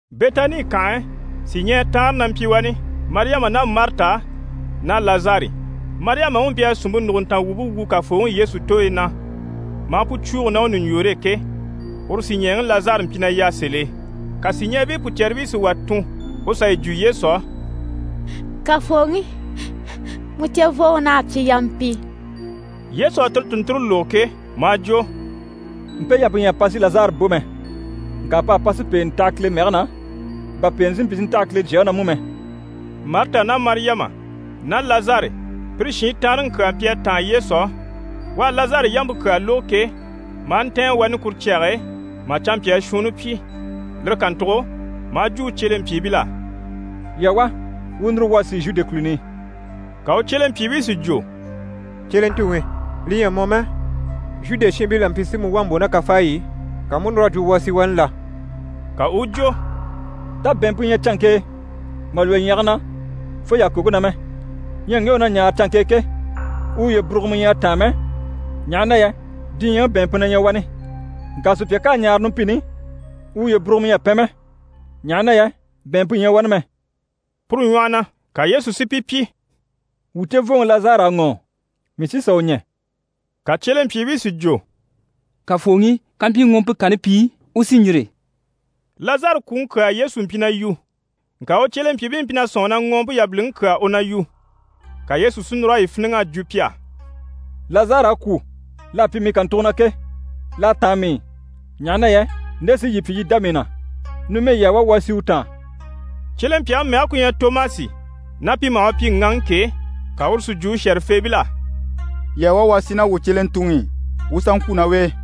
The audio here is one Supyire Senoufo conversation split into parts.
Bɛtani kànhe e, sìɲɛɛ taanre na mpyi wani: Mariyama ná Marita ná Lazari. Mariyamaŋi u mpyi a sìnmpe nùguntanga wumpe wu Kafooŋi Yesu tooyi na, maa pu cwuugo ná u ɲùɲjoore e ke, uru sìɲɛɛŋi Lazari mpyi na yà sèl'e. Ka sìɲɛɛbii pùcɛribii si wà tun u sà yi jwo Yesu á: «Kafooŋi, mu cevooŋi naha a pyi yampi.» Yesu à tire tùnnture lógo ke, maa jwo: «Mpe yampe ɲyɛ a pa si Lazari bò mɛ. Ŋka p'à pa si pèenɛ taha Kile mɛge na, bà pèenɛ si mpyi si ntaha Kile Jyaŋi na mú mɛ.» Marita ná Mariyama ná Lazari, pire shiin taanreŋi kyaa mpyi a táan Yesu á. U à Lazari yampe kyaa lógo ke, maa ntɛ̀ɛn wani kuru cyage e, mà canmpyaa shuunni pyi. Lire kàntugo maa jwo u cyelempyiibil'á: «Yii a wá, wuu núru wuu a sì Zhude kùluni i.» Ka u cyelempyiibii si jwo: «Cyelentuŋi, li ɲyɛ a mɔ mɛ, Zhude shiinbii la mpyi si mu wà mbò ná kafaayi i, ka mu u núr'a jwo wuu a sì wani la?» Ka u u jwo: «Tá bɛ̀ɛnmpe ɲyɛ canŋke e mà lwɔ́ ɲyɛ̀ge na fo yàkoŋke na mɛ? Ɲyɛ ŋge u na ɲaare canŋke e ke, u uye burugumɔ ɲyɛ a táan mɛ, ɲaha na yɛ diɲyɛŋi bɛ̀ɛnmpe na ɲyɛ wani. Ŋka sùpya ká a ɲaare numpini i, u uye burugumɔ ɲyɛ a pɛn mɛ, ɲaha na yɛ bɛ̀ɛnmpe ɲyɛ wani mɛ.» Puru ɲwɔhɔ na, ka Yesu si pi pyi: «Wuu cevooŋi Lazari à ŋɔ́ɔ, mii sí n‑sà u ɲɛ̀.» Ka cyelempyiibii si jwo: «Kafooŋi, kampyi ŋɔɔmpe kanni pi, u sí n‑yîri.» Lazari kwùŋi kyaa Yesu mpyi na yu, ŋka u cyelempyiibii mpyi na sɔ̂nŋi na ŋɔɔmpe yabiliŋi kyaa u na yu. Ka Yesu si núr'a yi fíniŋ'a jwo pi á: «Lazari à kwû. L'à pyi mii kàntugo na ke, l'à táan mii i, ɲaha na yɛ nde sí yii pyi yii i dá mii na. Numɛ yii a wá, wuu a sì u taan.» Cyelempyaŋi mɛge ku ɲyɛ Tomasi, ná pi maha u pyi: «Ŋaŋi» ke, ka uru si jwo u shɛ̀rɛfeebil'á: «Yii a wá, wuu a sì ná wuu cyelentuŋi i, wuu u sà ŋkwû ná u e.»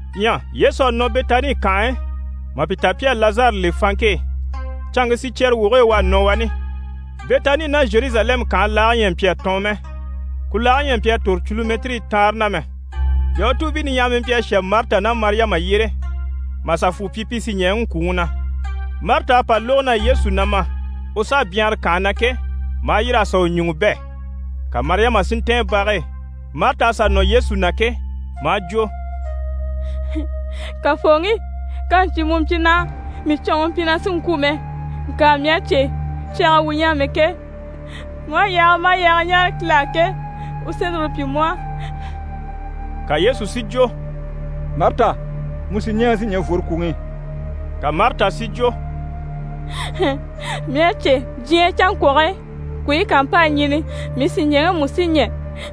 Ɲyɛ Yesu à nɔ Bɛtani kànhe e, mà pi ta pi à Lazari le fanŋke e, canŋke sicyɛɛre woge e u à nɔ wani. Bɛtani ná Zheruzalɛmu kànhe laage ɲyɛ a mpyi a tɔɔn mɛ. Ku laage ɲyɛ a tòro culumɛtirii taanre na mɛ. Yahutuubii niɲyahamii mpyi a shà Marita ná Mariyama yyére mà sà fwù pyi, pi sìɲɛɛŋi ŋkwùŋi na. Marita à pa lógo na Yesu na ma, u s'à byanhara kànhe na ke, maa yîr'a sà u ɲùŋɔ bɛ̂, ka Mariyama si ntɛ̀ɛn bage e. Marita à sà nɔ Yesu na ke, maa jwo: «Kafooŋi, kàmpyi mu mpyi naha, mii sìɲɛɛŋi mpyi na sì n‑kwû mɛ. Ŋka mii à cè, cyage e wuu ɲyɛ amɛ ke, mu aha kyaa maha kyaa ɲáare Kile á ke, u sí lire pyi mu á.» Ka Yesu si jwo: «Marita, mu sìɲɛɛŋi sí ɲɛ̀ n‑fworo kwùŋi i!» Ka Marita si jwo: «Mii à cè diɲyɛ canŋkwɔge kwùubii ká mpa a ɲɛ̀ni, mii sìɲɛɛŋi mú sí ɲɛ̀.»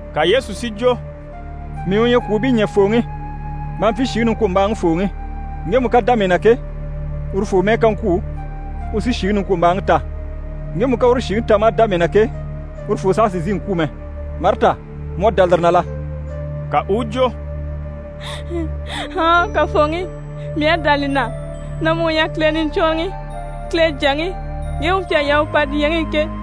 Ka Yesu si jwo: «Mii u ɲyɛ kwùubii ɲɛ̀fooŋi maa mpyi shìŋi niŋkwombaaŋifooŋi. Ŋgemu ká dá mii na ke, urufoo mɛ́ɛ ká ŋkwû, u sí shìŋi niŋkwombaaŋi ta. Ŋgemu ká uru shìŋi ta maa dá mii na ke, urufoo saha sì n‑sìi n‑kwû mɛ. Marita, mu à dá lire na la?» Ka u u jwo: «Ɔɔn Kafooŋi, mii à dá li na na mu u ɲyɛ Kile Niɲcwɔnrɔŋi, Kile Jyaŋi, ŋge u mpyi a yaa u pa diɲyɛŋi i ke.»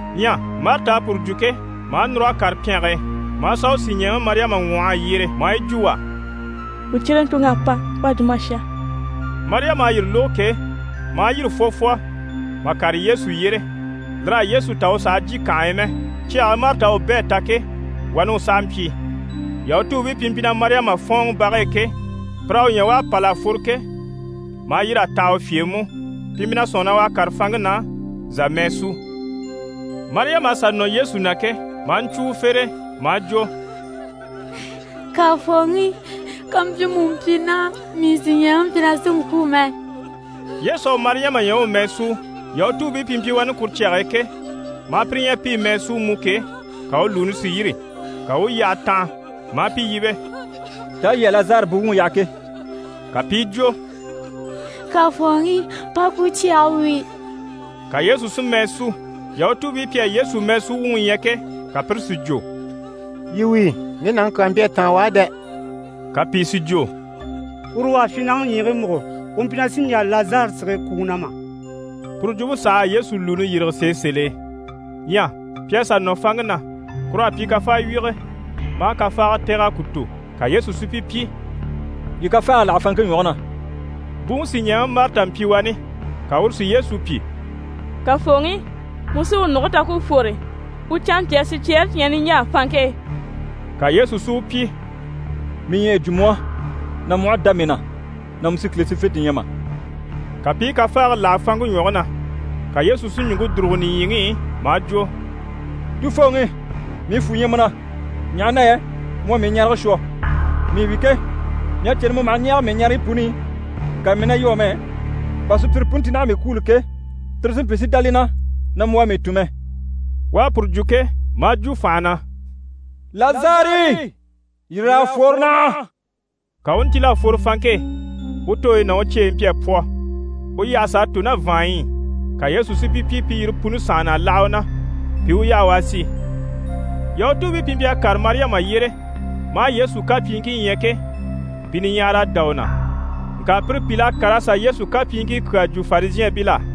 Ɲyɛ Marita à puru jwo ke, maa núr'a kàre pyɛnge e, maa sà u sìɲɛɛŋi Mariyama ŋwɔh'a yyere maa yi jwo u á: «Wuu cyelentuŋ'à pa, u à jwo mà shà.» Mariyama à yire lógo ke, maa yîri fwɔfwɔ mà kàre Yesu yyére. Lir'à Yesu ta u sàha jyè kànhe e mɛ. Cyage e Marita à u bɛ̂ a ta ke, wani u saha mpyi. Yahutuubii pi mpyi na Mariyama fɔ̀ɔnŋi bage e ke, pir'à u ɲya u à pâl'a fworo ke, maa yîr'a taha u fye e mú, pi mpyi na sɔ̂nŋi na u à kàre fanŋke na zà a mɛɛ súu. Mariyama à sà nɔ Yesu na ke, maa ɲcwo u fere e, maa jwo: «Kafooŋi, kàmpyi mu mpyi naha, mii sìɲɛɛŋi mpyi na sì n‑kwû mɛ.» Yesu à Mariyama ɲya u u mɛɛ súu, Yahutuubii pi mpyi wani kuru cyage e ke, maa pire ɲya pi i mɛɛ súu mú ke, ka u lùuni si yîri, ka u u yyahe tanha, maa pi yíbe: «Taa yii à Lazari buwuŋi yaha ke?» Ka pi i jwo: «Kafooŋi, pa ku cyage wíi.» Ka Yesu si mɛɛ sú. Yahutuubii pi à Yesu mɛɛsuwuŋi ɲya ke, ka pire si jwo: «Yii wíi, ŋge nàŋi kyaa mpyi a táan u á dɛ!» Ka pìi si jwo: «Uru u à fyin nàŋi ɲyiigii múgo, u mpyi na sì n‑jà Lazari sige kwùŋi na mà?» Puru jwumpe saha à Yesu lùuni yîrige sèe sèl'e. Ɲyɛ pi à sà nɔ fanŋke na, kur'à pyi kafawyige, maa kafaaga tɛ̀g'a ku tò. Ka Yesu si pi pyi: «Yii kafaage láha fanŋke ɲwɔge na.» Buŋi sìɲɛɛŋi Marita mpyi wani, ka uru si Yesu pyi: «Kafooŋi, mu sí u nùge ta ku u fwore, u canmpyaa sicyɛɛre cyi ɲyɛ niɲjaa fanŋke e.» Ka Yesu si u pyi: «Mii ɲyɛ a yi jwo mu á na mu aha dá mii na na mu sí Kile sífente ɲya mà?» Ka pi i kafaage láha fanŋke ɲwɔge na. Ka Yesu si ɲùŋke dùrugo nìɲyiŋi i, maa jwo: «Tufooŋi, mii fwù ɲyɛ mu na, ɲaha na yɛ mu à mii ɲarege shwɔ. Mii wi ke, mii à cè na mu maha ɲɛɛge mii ɲareyi puni i, ŋka mii na yu amɛ, bà sùpyire puni ti naha a mii kwûulo ke, tire si mpyi si dá li na na mu u à mii tun mɛ.» U à puru jwo ke, maa jwo fànha na: «Lazari, yîr'a fworo naha!» Ka u u ntíl'a fworo fanŋke e, u tooyi ná u cyeyi mpyi a pwɔ, u yyahe s'à tò ná vàanɲyi i, ka Yesu si pi pyi pi yire puni sànhana a láha u na, pi i u yaha u a sì. Yahutuubii pi mpyi a kàre Mariyama yyére, maa Yesu kapyiiŋkii ɲya ke, pi niɲyahara à dá u na. Ŋka pire pìl'à kàr'a sà Yesu kapyiiŋkii kyaa jwo Farizhɛɛnbil'á.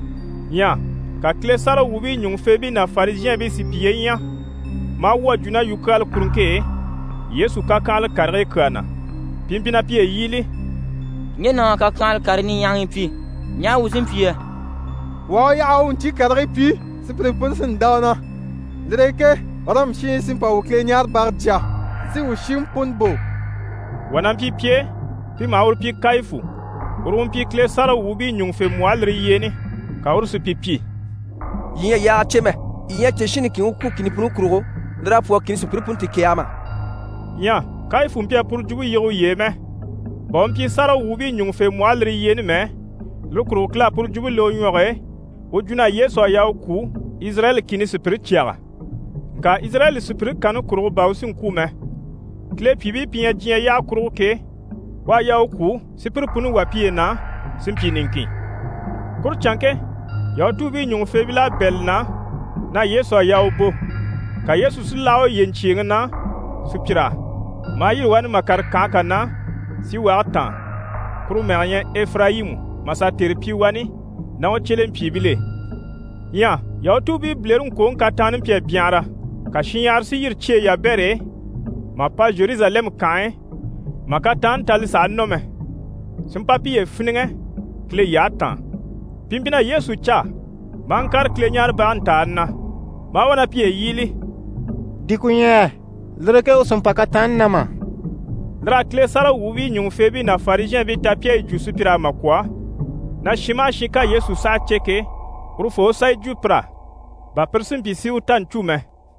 Ɲyɛ ka Kile sáragawwuubii ɲùŋufeebii ná Farizhɛɛnbii si piye ɲya, maa wwɔ̀ a jwo ná yukyaala kuruŋke e Yesu kakyanhala karigii kyaa na. Pi mpyi na piye yíbili: «Ŋge nàŋ'à kakyanhala karii niɲyahagii pyi! Ɲaha wuu sí n‑pyi yɛ? Wuu aha u yaha u u ɲcyii karigii pyi, sùpyire puni sí n‑dá u na. Lire e ke Ɔrɔmu shiinbii sí n‑pa wuu Kileɲaarebage jya, si wuu shiŋi puni bò.» Wà na mpyi pi e, pi maha uru pyi Kayifu. Uru u mpyi Kile sáragawwuubii ɲùŋufembwɔhe lire yyeeni. Ka uru si pi pyi: «Yii ɲyɛ a yaage cè mɛ! Yii ɲyɛ a cè shin niŋkin u kwû kìni puni kurugo, lir'à pwɔ́rɔ kìni sùpyire puni ti kɛ̀ɛgɛ mà?» Ɲyɛ Kayifu mpyi a puru jwumpe yige uye e mɛ. Bà u mpyi sáragawwuubii ɲùŋufembwɔhe lire yyeeni mɛ, lire kurugo Kile à puru jwumpe le u ɲwɔge e, u jwo na Yesu à yaa u kwû Izirayɛli kìni sùpyire cyaga. Ŋka Izirayɛli sùpyire kanni kurugo bà u sí n‑kwû mɛ. Kile pyìibii pi ɲyɛ diɲyɛ yyaha kurugo ke, u à yaa u kwû si pire puni wà piye na, si mpyi niŋkin. Kuru canŋke, Yahutuubii ɲùŋufeebil'à bɛ̂ li na na Yesu à yaa u bò. Ka Yesu si láha uye ɲcyèeŋi na sùpyir'á. Maa yîri wani mà kàre kànhe kà na síwage taan, kuru mɛge ɲyɛ Efirayimu, mà sà tère pyi wani ná u cyelempyiibil'e. Ɲyɛ Yahutuubii bilereŋkwoŋi kataanni mpyi a byanhara, ka shinɲyahara si yîri cyeyi yabɛre e mà pa Zheruzalɛmu kànhe e mà kataanni ta li sàha nɔ mɛ, si mpa piye fíniŋɛ Kile yyahe taan. Pi mpyi na Yesu caa, maa ŋkàre Kileɲaarebage ntàani na. Maa wá na piye yíbili: «Di ku ɲyɛ yɛ? Lire e ke u sì n‑pa kataanni na mà?» Lir'à Kile sáragawwuubii ɲùŋufeebii ná Farizhɛɛnbii ta pi à yi jwo sùpyir'á mà kwɔ̀ na shin maha shin ká Yesu saha cè ke, urufoo u sà yi jwo pir'á, bà pire si mpyi si u ta ɲcû mɛ.